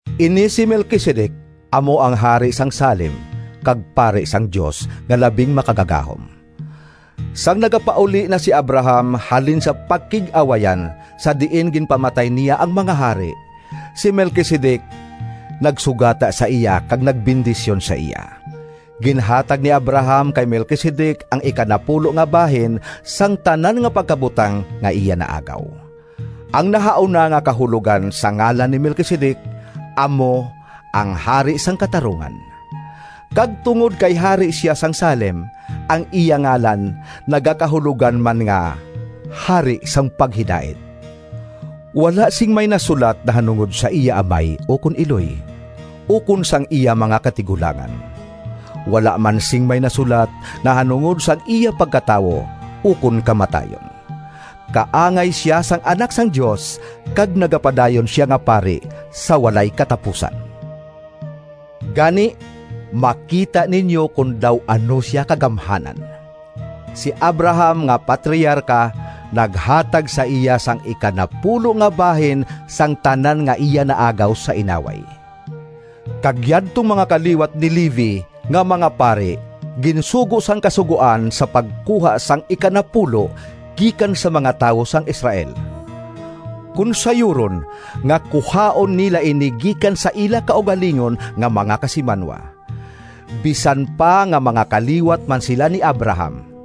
Ini si Melquisedec amo ang hari sang Salem kag pari sang Dios nga Labing Makagagahom. Sang nagapauli na si Abraham halin sa pakig-awayan sa diin ginpamatay niya ang mga hari, si Melquisedec nagsugata sa iya kag nagbendisyon sa iya. Ginhatag ni Abraham kay Melquisedec ang ikanapulo nga bahin sang tanan nga pagkabutang nga iya naagaw. (Ang nahauna nga kahulogan sang ngalan ni Melquisedec amo ang “Hari sang Katarungan.” Kag tungod kay hari sia sang Salem, ang iya ngalan nagakahulogan man nga “Hari sang Paghidait.”) Wala sing may nasulat nahanungod sa iya amay ukon iloy, ukon sang iya mga katigulangan. Wala man sing may nasulat nahanungod sang iya pagkatawo ukon kamatayon. Kaangay sia sang Anak sang Dios, kag nagapadayon sia nga pari sa walay katapusan. Gani makita ninyo kon daw ano sia kagamhanan! Si Abraham nga patriarka naghatag sa iya sang ikanapulo nga bahin sang tanan nga iya naagaw sa inaway. Kag yadtong mga kaliwat ni Levi nga mga pari ginsugo sang Kasugoan sa pagkuha sang ikanapulo gikan sa mga tawo sang Israel. Kon sayuron nga kuhaon nila ini gikan sa ila kaugalingon nga mga kasimanwa, bisan pa nga mga kaliwat man sila ni Abraham.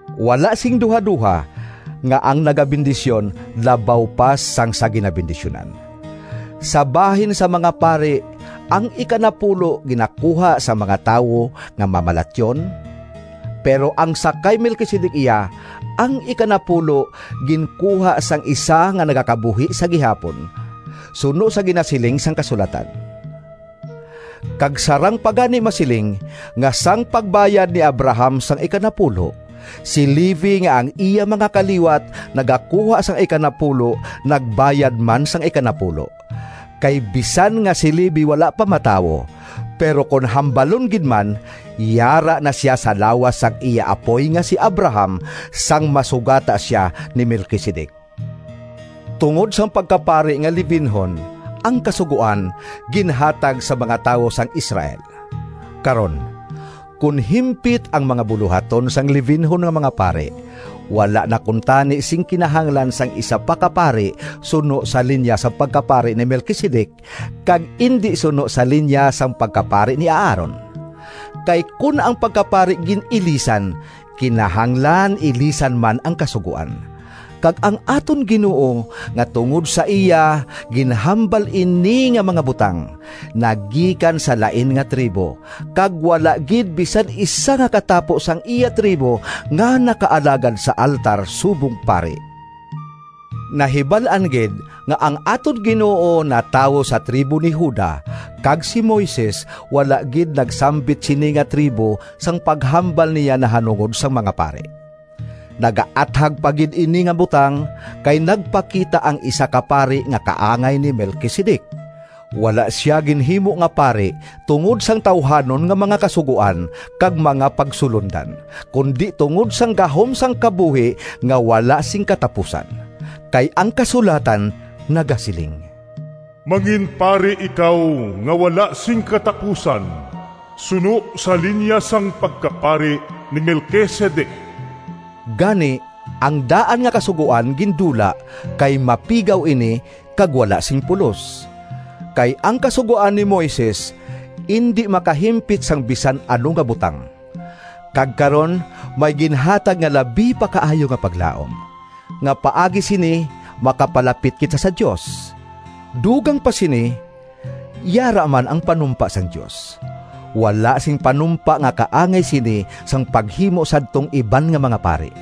Wala sing duhadoha nga ang nagabendisyon labaw pa sang sa ginabendisyunan. Sa bahin sang mga pari, ang ikanapulo ginakuha sang mga tawo nga mamalatyon, pero ang sa kay Melquisedec iya, ang ikanapulo ginkuha sang isa nga nagakabuhi sa gihapon, suno sa ginasiling sang kasulatan. Kag sarang pa gani masiling nga sang pagbayad ni Abraham sang ikanapulo, si Levi nga ang iya mga kaliwat nagakuha sang ikanapulo nagbayad man sang ikanapulo. Kay bisan nga si Levi wala pa matawo, pero kon hambalon gid man yara na sia sa lawas sang iya apoy nga si Abraham, sang masugata sia ni Melquisedec. Tungod sang pagkapari nga Levinhon, ang Kasugoan ginhatag sa mga tawo sang Israel. Karon, kon himpit ang mga bulohaton sang Levinhon nga mga pari, wala na kuntani sing kinahanglan sang isa pa ka pari suno sa linya sang pagkapari ni Melquisedec, kag indi suno sa linya sang pagkapari ni Aaron. Kay kon ang pagkapari gin-ilisan, kinahanglan ilisan man ang kasugoan. Kag ang aton Ginoo, nga tungod sa iya ginhambal ini nga mga butang, nagikan sa lain nga tribo, kag wala gid bisan isa nga katapo sang iya tribo nga nakaalagad sa altar subong pari. Nahibal-an gid nga ang aton Ginoo natawo sa tribo ni Juda, kag si Moises wala gid nagsambit sini nga tribo sang paghambal niya nahanungod sang mga pari. Nagaathag pa gid ini nga butang, kay nagpakita ang isa ka pari nga kaangay ni Melquisedec. Wala sia ginhimo nga pari tungod sang tawuhanon nga mga kasugoan kag mga pagsulondan, kundi tungod sang gahom sang kabuhi nga wala sing katapusan. Kay ang kasulatan nagasiling, “Manginpari ikaw nga wala sing katapusan, suno sa linya sang pagkapari ni Melquisedec.” Gani ang daan nga kasugoan gindula, kay mapigaw ini kag wala sing pulos. Kay ang Kasugoan ni Moises indi makahimpit sang bisan ano nga butang. Kag karon may ginhatag nga labi pa kaayo nga paglaom, nga paagi sini makapalapit kita sa Dios. Dugang pa sini, yara man ang panumpa sang Dios. Wala sing panumpa nga kaangay sini sang paghimo sadtong iban nga mga pari.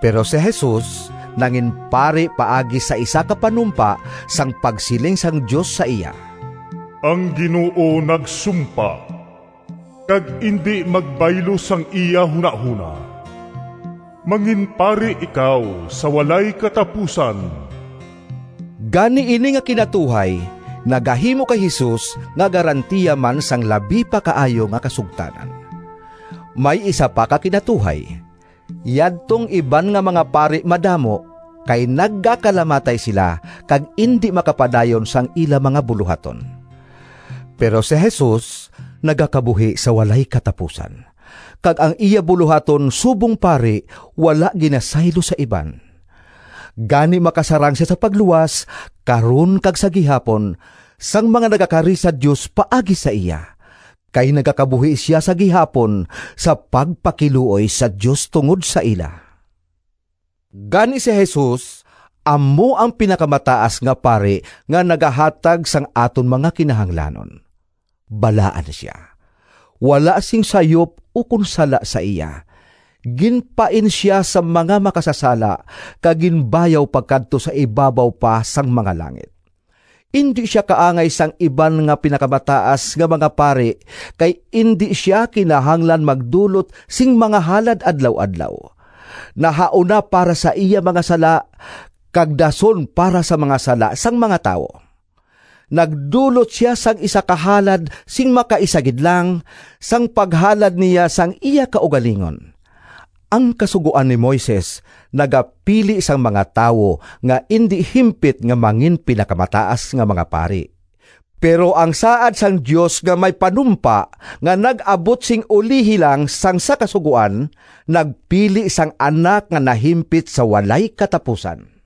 Pero si Jesus nanginpari paagi sa isa ka panumpa, sang pagsiling sang Dios sa iya: “Ang Ginoo nagsumpa, Kag indi magbaylo Sang iya hunahona: ‘Manginpari ikaw Sa walay katapusan.’” Gani ini nga kinatuhay nagahimo kay Jesus nga garantiya man sang labi pa kaayo nga kasugtanan. May isa pa ka kinatuhay: yadtong iban nga mga pari madamo, kay nagakalamatay sila kag indi makapadayon sang ila mga bulohaton. Pero si Jesus nagakabuhi sa walay katapusan, kag ang iya bulohaton subong pari wala ginasaylo sa iban. Gani makasarang sia sa pagluwas, karon kag sa gihapon, sang mga nagakari sa Dios paagi sa iya, kay nagakabuhi sia sa gihapon sa pagpakiluoy sa Dios tungod sa ila. Gani si Jesus amo ang Pinakamataas nga Pari nga nagahatag sang aton mga kinahanglanon! Balaan sia; wala sing sayop ukon sala sa iya; ginpain sia sa mga makasasala kag ginbayaw pakadto sa ibabaw pa sang mga langit. Indi sia kaangay sang iban nga pinakamataas nga mga pari, kay indi sia kinahanglan magdulot sing mga halad adlaw-adlaw, nahauna para sa iya mga sala, kag dason para sa mga sala sang mga tawo. Nagdulot sia sang isa ka halad, sing makaisa gid lang, sang paghalad niya sang iya kaugalingon. Ang Kasugoan ni Moises nagapili sang mga tawo nga indi himpit nga manginpinakamataas nga mga pari, pero ang saad sang Dios nga may panumpa nga nag-abot sing ulihi lang sang sa Kasugoan, nagpili sang Anak nga nahimpit sa walay katapusan.